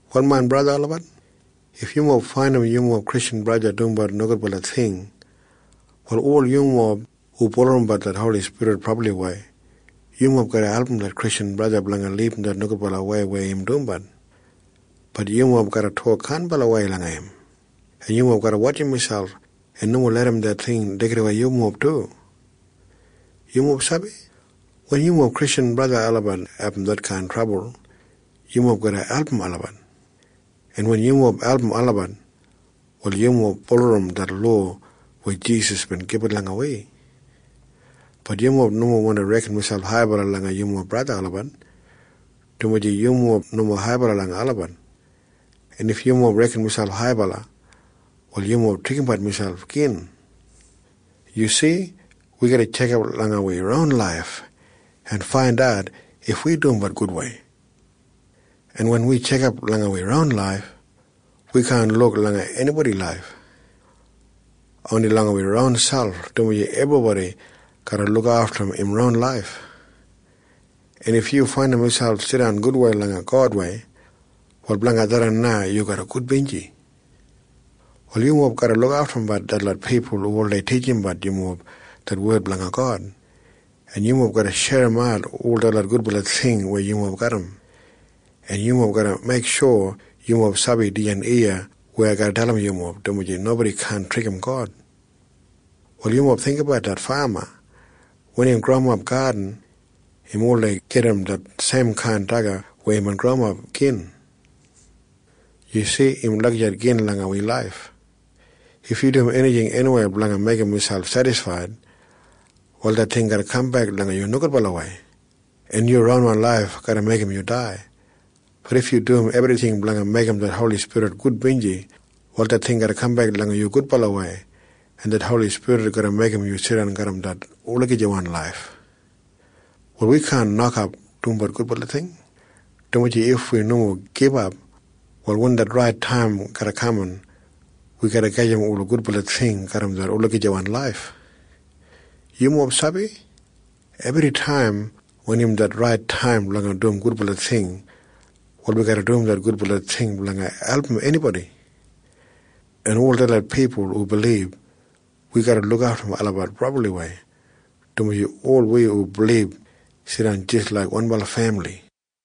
Wal main braja en sista olabat, if yumob faindim yumob Kristjan braja o sista dumbat nogudbala ting, wal ol yumob hu bulurrum det Holi Spirit brabliwei, yumob garra album det Kristjan braja o sista blanga libum det nogudbalawei weya im dumbat. Bat yumob garra tok kainbalawei langa im, en yumob garra wotjim miselp en nomo larram det ting deigidawei yumob du. Yumob sabi? Wen yumob Kristjan olabat abum detkain trabul, yumob garra album olabat, en wen yumob album olabat, wal yumob bulurrum det lowa weya Jisas Krais bin gibit langa wi. Bat yumob nomo wandi reken miselp haibala langa yumob braja en sista olabat, dumaji yumob nomo haibala langa olabat. En if yumob reken miselp haibala, wal yumob trikimbat miselp gin. Yu si? Wi garra tjekap langa wi ronwan laif en faindat if wi dumbat gudwei, en wen wi tjekap langa wi ronwan laif, wi kaan luk langa enibodi laif. Oni langa wi ronselp, dumaji ebribodi garra lukaftum im ron laif. En if yu faindim miselp jidan gudwei langa Godwei, wal blanga tharran na yu garra gudbinji. Wal yumob garra lukaftumbat detlot pipul hu oldei titjimbat yumob det wed blanga God, en yumob garra sherimat ol detlot gudbala ting weya yumob garram. En yumob garra meiksho yumob sabi dijan iya weya ai garra dalim yumob, dumaji nobodi kaan trikim God. Wal yumob jinggabat det fama. Wen im growimap gadin, im oldei gedim det seimkain daga weya imbin growimap gin. Yu si? Im lagijat gin langa wi laif. If yu dum enijing eniwei blanga meigim miselp sedisfaid, wal det ting garra kambek langa yu nogudbalawei, en yu ronwan laif garra meigim yu dai. Bat if yu dum ebrijing blanga meigim det Holi Spirit gudbinji, wal det ting garra kambek langa yu gudbalawei, en det Holi Spirit garra meigim yu jidan garram det olagijawan laif. Wal wi kaan nokap dumbat gudbala ting, dumaji if wi nomo gibap, wal wen det rait taim garra kaman, wi garra gajim ola gudbala ting garram det olagijawan laif. Yumob sabi? Ebritaim wen im det rait taim blanga dum gudbala ting, wal wi garra dum det gudbala ting blanga album enibodi. En ol detlot pipul hu bilib, wi garra lukaftum olabat brabliwei, dumaji ol wi hu bilib jidan jis laik wanbala femili.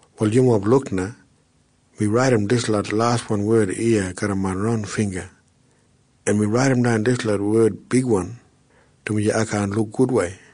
Wal yumob luk na. Mi raidimdan dislot laswan wed iya garram main ronwan bingga, en mi raidimdan dislot wed bigwan, dumaji ai kaan luk gudwei.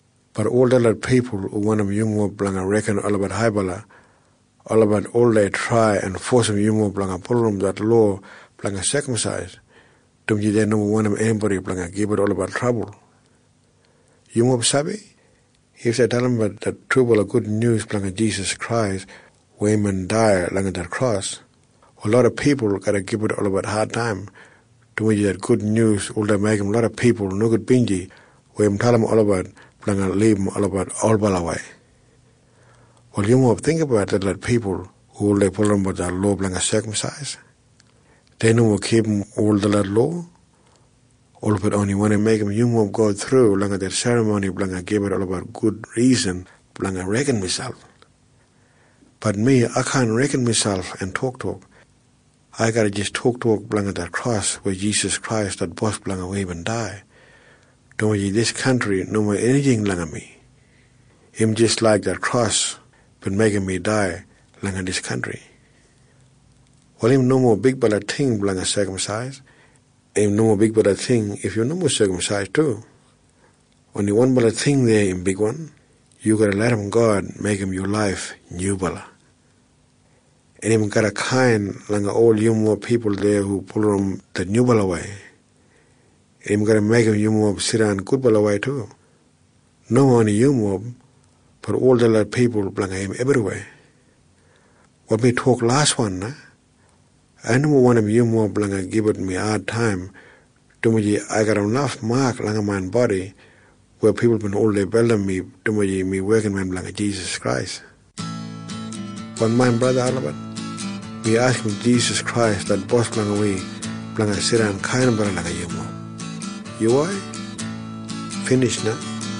Ol detlot pipul hu wandim yumob blanga reken olabat haibala, olabat oldei trai en fosim yumob blanga bulurrum det lowa blanga sekamsais, dumaji dei nomo wandim enibodi blanga gibit olabat trabul. Yumob sabi? If dei dalimbat det trubala gudnyus blanga Jisas Krais weya imbin dai langa det kros, wal loda pipul garra gibit olabat adtaim, dumaji det gudnyus oldei meigim loda pipul nogudbinji weya im dalim olabat blanga libum olabat olbalawei. Wal yumob jinggabat detlot pipul hu oldei bulurrum det lowa blanga sekamsais. Dei nomo kipum ol detlot lowa. Olabat oni wandi meigim yumob go thru langa det serramoni blanga gibit olabat gud risan blanga reken miselp. Bat mi, ai kaan reken miselp en toktok. Ai garra jis toktok blanga det kros weya Jisas Krais det Bos blanga wi bin dai, dumaji dijan kantri nomo enijing langa mi. Im jis laik det kros bin meigim mi dai langa dijan kantri. Wal im nomo bigbala ting blanga sekamsais. En im nomo bigbala ting if yu nomo sekamsais du. Oni wanbala ting deya im bigwan. Yu garra larram God meigim yu laif nyubala. En im garra kain langa ol yumob pipul deya hu bulurrum det nyubalawei. En im garra meigim yumob jidan gudbalawei du. Nomo oni yumob. Bat ol detlot pipul blanga im ebriweya. Wal mi tok laswan na. Ai nomo wandim yumob blanga gibit mi adtaim, dumaji ai garram naf mak langa main bodi weya pipul bin oldei beldimbat mi dumaji mi wekinmen blanga Jisas Krais. Wal main braja en sista olabat, mi askim Jisas Krais det Bos blanga wi blanga jidan brabli kainbala langa yumob. Yuwai. Binij na.